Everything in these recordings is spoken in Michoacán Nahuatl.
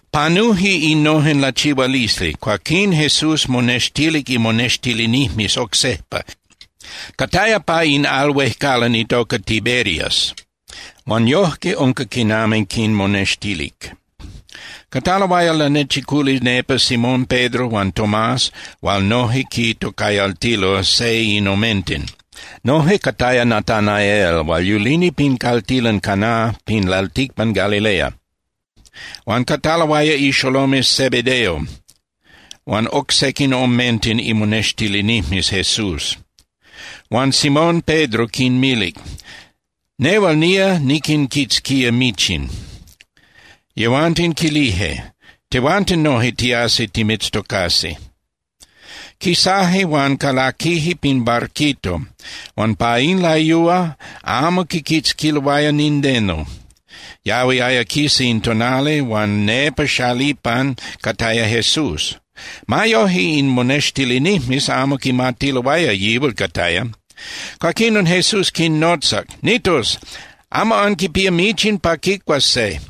Panuje innojen lachihualisli. Cuaquín Jesús monextilic imonextilinijmes oc sejpa, cataya pa in al huejcalan itoca Tiberias. Huan yojque unca quinami quinmonextilic. Cataloaya lanechiculi nepa Simón Pedro huan Tomás hual noje quitocayaltiloaya “Seinomenten”. Noje cataya Natanael hual yulini pin caltilan Cana pin lalticpan Galilea, huan cataloaya ixolomes Zebedeo huan oc sequin omenten imonextilinijmes Jesús. Huan Simón Pedro quinmilic: —Nehual nía niquinquitzquía michin. Yehuanten quilije: —Tehuanten noje tiasi timitztocasi. Quisaje huan calaquije pin barquito huan pa in layúa amo quiquitzquiloaya nindeno. Yahuiaya quisa in tonali, huan nepa xalipan cataya Jesús. Ma yoje in monextilinijmes amo quimatiloaya yihual cataya. Cuaquinon Jesús quinnotzac: —Nitos, ¿amo anquipía michin pa quicuas se?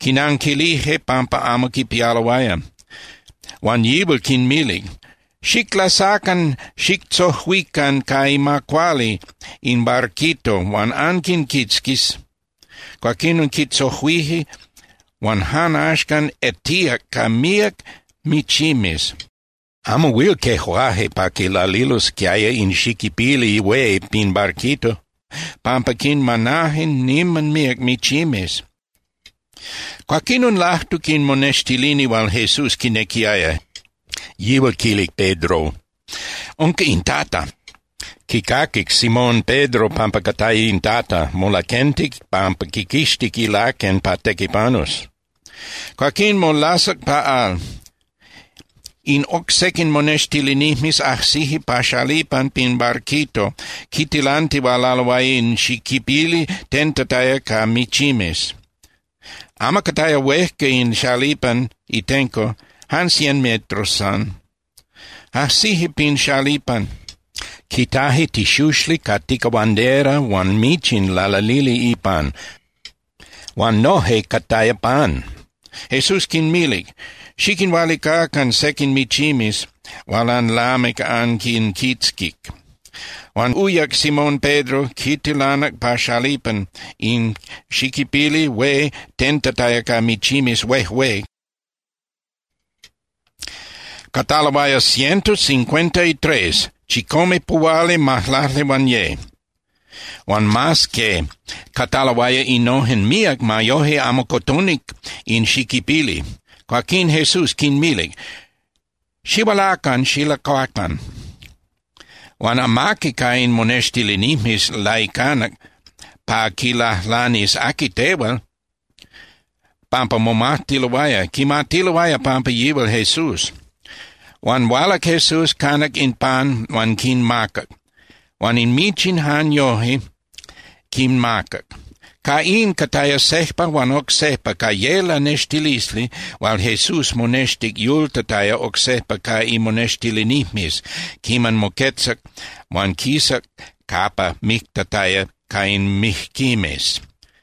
Quinanquilije pampa amo quipialoaya. Huan yihual quinmilic: —Xiclasacan xictzojuican ca ima cuali in barquito huan anquinquitzquis. Cuaquín quitzojuije huan jan axcan etíac ca míac michimes, amo huil quejuaje pa quilalilosquiaya in xiquipili hué pin barquito pampa quinmanaje niman míac michimes. Cuaquinon lajtuc in monextilini hual Jesús quinequiaya, yihual quilic Pedro: —¡Unca in Tata! Quicaquic Simón Pedro pampa cataya in Tata, molaquentic pampa quiquixtic ilaquen pa tequipanus. Cuaquín molasac pa al. In oc sequin monextilinijmes ajsije pa xalipan pin barquito quitilantihualaloaya in xiquipili tentataya ca michimes. Amo cataya huejca in xalipan itenco, jan cien metros san. Ajsije pin xalipan, quitaje tixuxli ca ticahuandera huan michin lalalili ipan, huan noje cataya pan. Jesús quinmilic: —Xiquinhualicacan sequin michimes hual anlamic anquinquitzquic. Huan uyac Simón Pedro, quitilanac pa xalipan in xiquipili hué tentataya ca michimes huejué, cataloaya ciento cincuenta y tres (chicomepuhualimajlaclihuanye). Huan mas que cataloaya innojen míac, ma yoje amo cotonic in xiquipili. Cuaquín Jesús quinmilic: —Xihualacan xilacuacan. Huan amaqui ca in monextilinijmes laicanac pa quilajlanis: “¿Aqui tehual?”, pampa momajtiloaya, quimatiloaya pampa yihual Jesús. Huan hualac Jesús, canac in pan huan quinmacac, huan in michin jan yoje quinmacac. Ca in, cataya sejpa huan oc sejpa ca ye lanextilisli hual Jesús monextic yultataya oc sejpa ca imonextilinijmes quiman moquetzac huan quisac capa mictataya ca in mijquimes.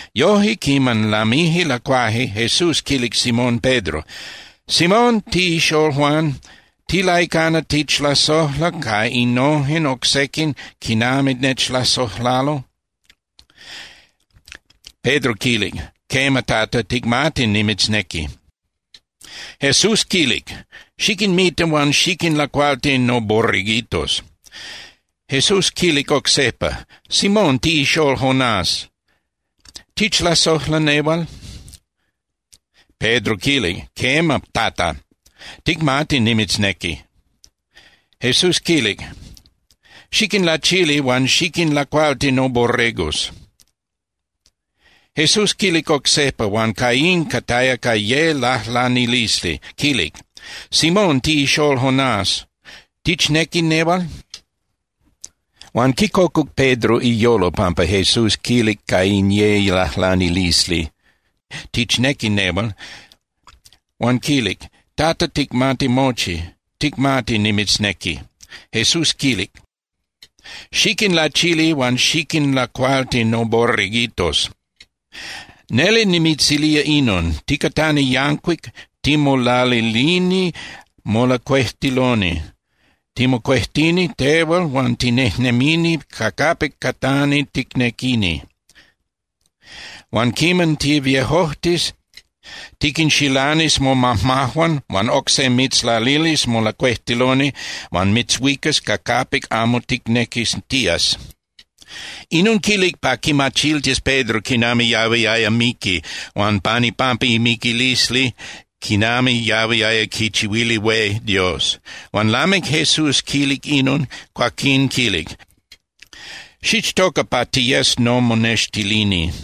Yoje, quiman lamije lacuaje, Jesús quilic Simón Pedro: —Simón, tiꞌixól Juan, ¿tilaicana tichlasojla ca innojen oc sequin quinami nechlasojlalo? Pedro quilic: —Quema, Tata, ticmati nimitznequi. Jesús quilic: —Xiquinmita huan xiquinlacualti noborreguitos. Jesús quilic oc sejpa: —Simón, tiꞌixól Jonás, ¿tichlasojla nehual? Pedro quilic: —Quema, Tata, ticmati nimitznequi. Jesús quilic: —Xiquinlachili huan xiquinlacualti noborregos. Jesús quilic oc sejpa, huan ca in cataya ca ye lajlanilisli, quilic: —Simón, tiꞌixól Jonás, ¿tichnequi nehual? Huan quicocuc Pedro iyolo pampa Jesús quilic ca in ye lajlanilisli: “¿Tichnequi nehual?” Huan quilic: —Tata, ticmati mochi, ticmati nimitznequi. Jesús quilic: —Xiquinlachili huan xiquinlacualti noborreguitos. Neli, nimitzilía inon: Ticatani yancuic, timolalilini molacuejtiloni, timocuejtini tehual huan tinejnemini ca capic catani ticnequini. Huan quiman tiviejojtis, tiquinxilanis momajmajuan huan oc se mitzlalilis molacuejtiloni huan mitzhuicas ca capic amo ticnequis tías. Inon quilic pa quimachiltis Pedro quinami yahuiaya miqui huan pan ipampa imiquilisli quinami yahuiaya quichihuili hué Dios. Huan lamic Jesús quilic inon, cuaquín quilic: —Xichtoca pa tiyes nomonextilini.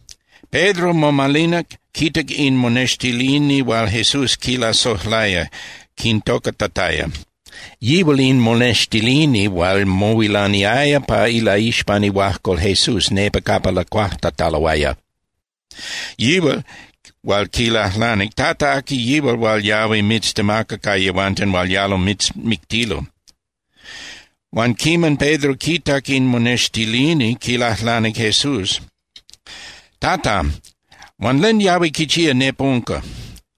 Pedro momalinac, quitac in monextilini hual Jesús quilasojlaya, quintocatataya. Yihual in monextilini hual mohuilaniaya pa ilaixpan ihuajcol Jesús nepa capa lacuajtataloaya, yihual hual quilajlanic: “Tata, ¿aqui yihual hual yahui mitztemaca ca yehuanten hual yalo mitzmictilo?” Huan quiman Pedro quitac in monextilini, quilajlanic Jesús: —Tata, huan ¿len yahui quichía nepa unca?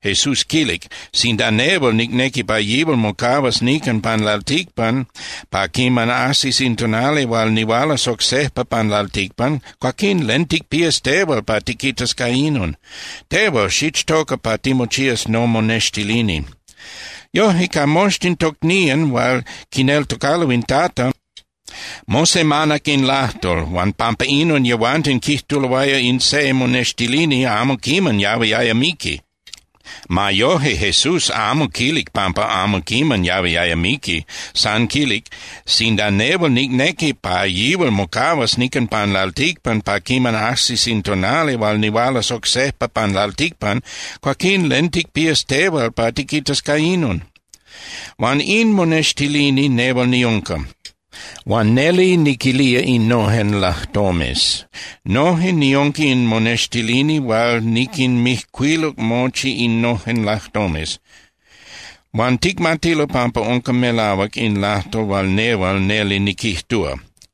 Jesús quilic: —Sinda nehual nicnequi pa yihual mocahuas nican pan lalticpan pa quiman ajsis in tonali hual nihualas oc sejpa pan lalticpan, cuaquín ¿len ticpías tehual pa tiquitas ca inon? Tehual xichtoca pa timochías nomonextilini. Yoje, ca moxtin tocnían hual quineltocalo in Tata, mosemanac in lajtol, huan pampa inon yehuanten quijtuloaya in se monextilini amo quiman yahuiaya miqui. Ma yoje, Jesús amo quilic pampa amo quiman yahuiaya miqui. San quilic: “Sinda nehual nicnequi pa yihual mocahuas nican pan lalticpan pa quiman ajsis in tonali hual nihualas oc sejpa pan lalticpan, cuaquín ¿len ticpías tehual pa tiquitas ca inon?” Huan in monextilini nehual niunca. Huan neli niquilía innojen lajtomes. Noje niunca in monextilini hual niquinmijcuiluc mochi innojen lajtomes. Huan ticmatilo pampa unca melahuac in lajtol hual nehual neli niquijtúa.